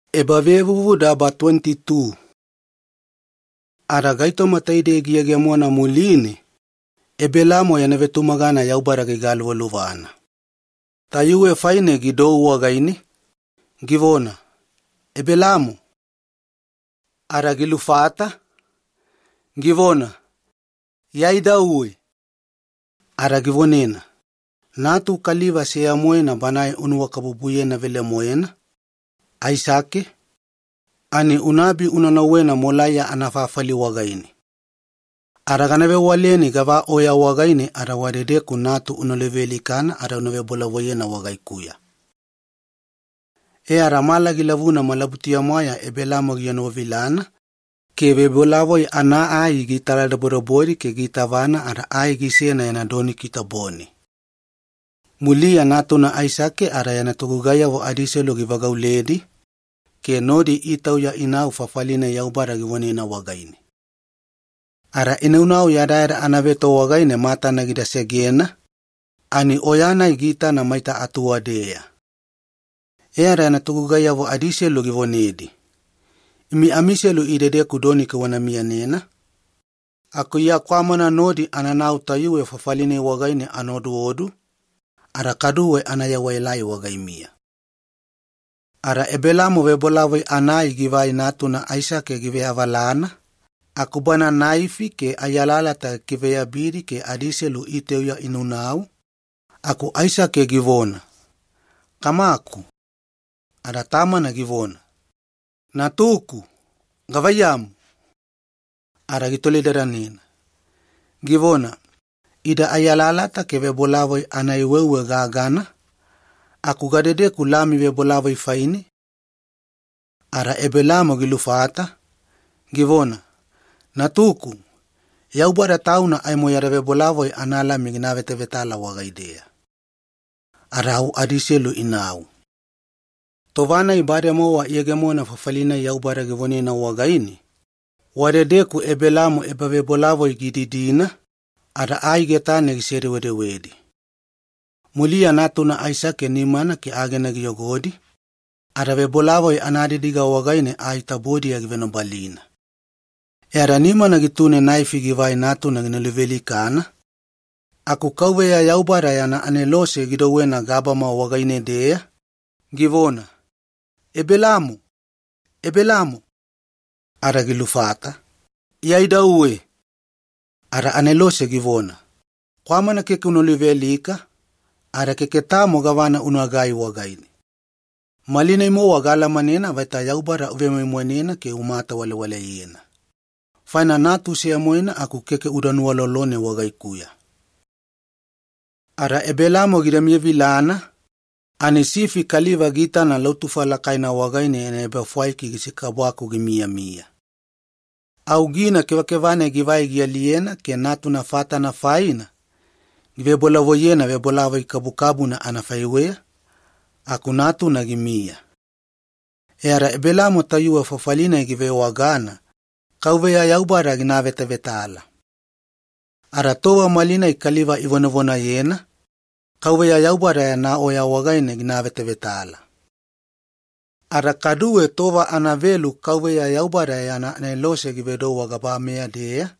Ebelaamo anagaluvaluva. Ada gaitoma taidei giyegemona muline, Ebelaamo yana vetumagana Yaubada gigaluvaluvana. Tayuwe faine gidou wagaine, givona, “Ebelaamo!” Ada gilufata, givona, “Iya idauwe.” Ada givonena, “Natu kaliva seya-moena banae unuwakabubuyena velemoena, Aisake, ani unaabi una nauwena oya Molaiya anafafali wagaine. Ada gana vewaleni gava oya wagaine ada wadedeku natu una luvealikana ada una vebolavoiyena wagaikuya.” E ada mala gilavuna malabutuya-mwaeya Ebelaamo gienovilana ke vebolavoi anaai gitaladobodobodi ke giitavana ada ai gisena yana doniki tabone. Muliya natuna Aisake ada yana togugaiyavo adiselu givagauledi ke nodi itauya inau fafali-nai Yaubada givonena wagaine. Ada inaunau yadayada anaveto wagaine matana gida segena ani oya-nai giitana maita atuwadeya. E ada yana togugaiyavo adiselu givonedi, “Imi amiselu idedeku doniki wana miyanena aku iya kwamana nodi ananau tayuwe fafali-nai wagaine ana oduodu ada kaduwe ana yewaelai wagaimiya.” Ada Ebelaamo vebolavoi anaai givai natuna Aisake giveavalana aku bana naifi ke ai alalata gikiveyabidi ke adiselu itauya inaunau, aku Aisake givona, “Kamaku.” Ada tamana givona, “Gavaiyamu, natuku?” Ada gitolidadanena, givona, “Ida ai alalata ke vebolavoi anaai weuwe gagana, aku gadedeku lami vebolavoi faine?” Ada Ebelaamo gilufata, givona, “Natuku, Yaubada Tauna aimo yada vebolavoi analami gina avetavetala wagaideya.” Ada au adiselu inau. Tova-nai bademowa iyegemona fafali-nai Yaubada givonena wagaine, wadedeku Ebelaamo ebavebolavoi gididina, ada ai getane gisedewedewedi. Muliya natuna Aisake nimana ke agena giyogodi ada vebolavoi anadidiga wagaine ai tabodiya givenobalina. E ada nimana gitune naifi givai natuna gina luvealikana, aku Yaubada yana Anelose gidouwena gabama wagaine-deya, givona, “Ebelaamo! Ebelaamo!” Ada gilufata, “Iya idauwe.” Ada Anelose givona, “Kwamana keke una luvealika, ada keke tamo gavana unagai wagaine. Malinai-mowa gaalamanena vaita uvemoimoineku ke umatawalewale wagaikuya, faina natu seya-moena aku keke uda nuwalolone wagaikuya.” Ada Ebelaamo gida miyavilana ani sifi kaliva giitana lautufa lakaina wagaine yana ebafwaiki gisikabwaku gimiyamiya. Au gina kevakeva-nai givai gialiyena ke natuna fatana faina givebolavoiyena vebolavoi kabukabuna anafaiweya, aku natuna gimiya. E ada Ebelaamo tayuwe fafali-nai givewagana 'Yaubada Ginaavetavetala'. Ada tova malinai kaliva ivonavonayena ‘Yaubada Yana Oya Wagaine Ginaavetavetala’. Ada kaduwe tova anavelu Yaubada yana Anelose givedou wagabameya-deya,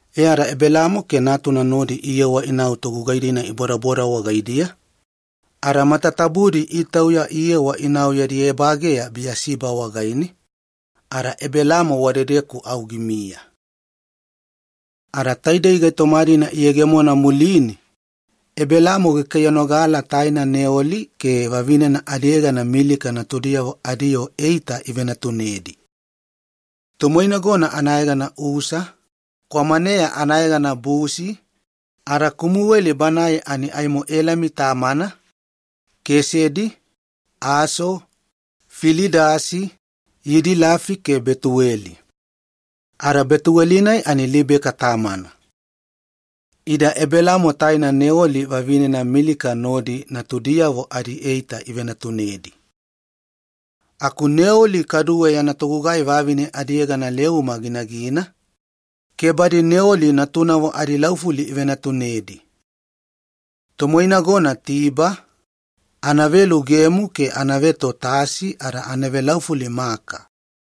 E ada Ebelaamo ke natuna nodi iyewa inau togugai-dina ibodaboda wagaidiya, ada matatabudi itauya iyewa inau yadi ebageya Biyasiba wagaine, ada Ebelaamo wadedeku au gimiya. Neoli yana tubudelideli. Ada taidei gaitoma-dina iyegemona muline, Ebelaamo gikaiyanogala taina Neoli ke vavinena adiyegana Milika natudiyavo adiyoo eita ivenatunedi. Tomoinagona anayegana Usa, kwamaneya anayegana Busi, ada Kumuweli banae ani aimo Elami tamana, Kesedi, Aso, Filidasi Yidilafi ke Betuweli. Ada Betuweli-nai ani Libeka tamana. Ida Ebelaamo taina Neoli vavinena Milika nodi natudiyavo adieita ivenatunedi. Aku Neoli kaduwe yana togugai vavine adiyegana Leuma ginagina ke badi Neoli natunavo adilaufuli ivenatunedi. Tomoinagona Tiba, anavelu Geemu ke anaveto Tasi ada anavelaufuli Maaka.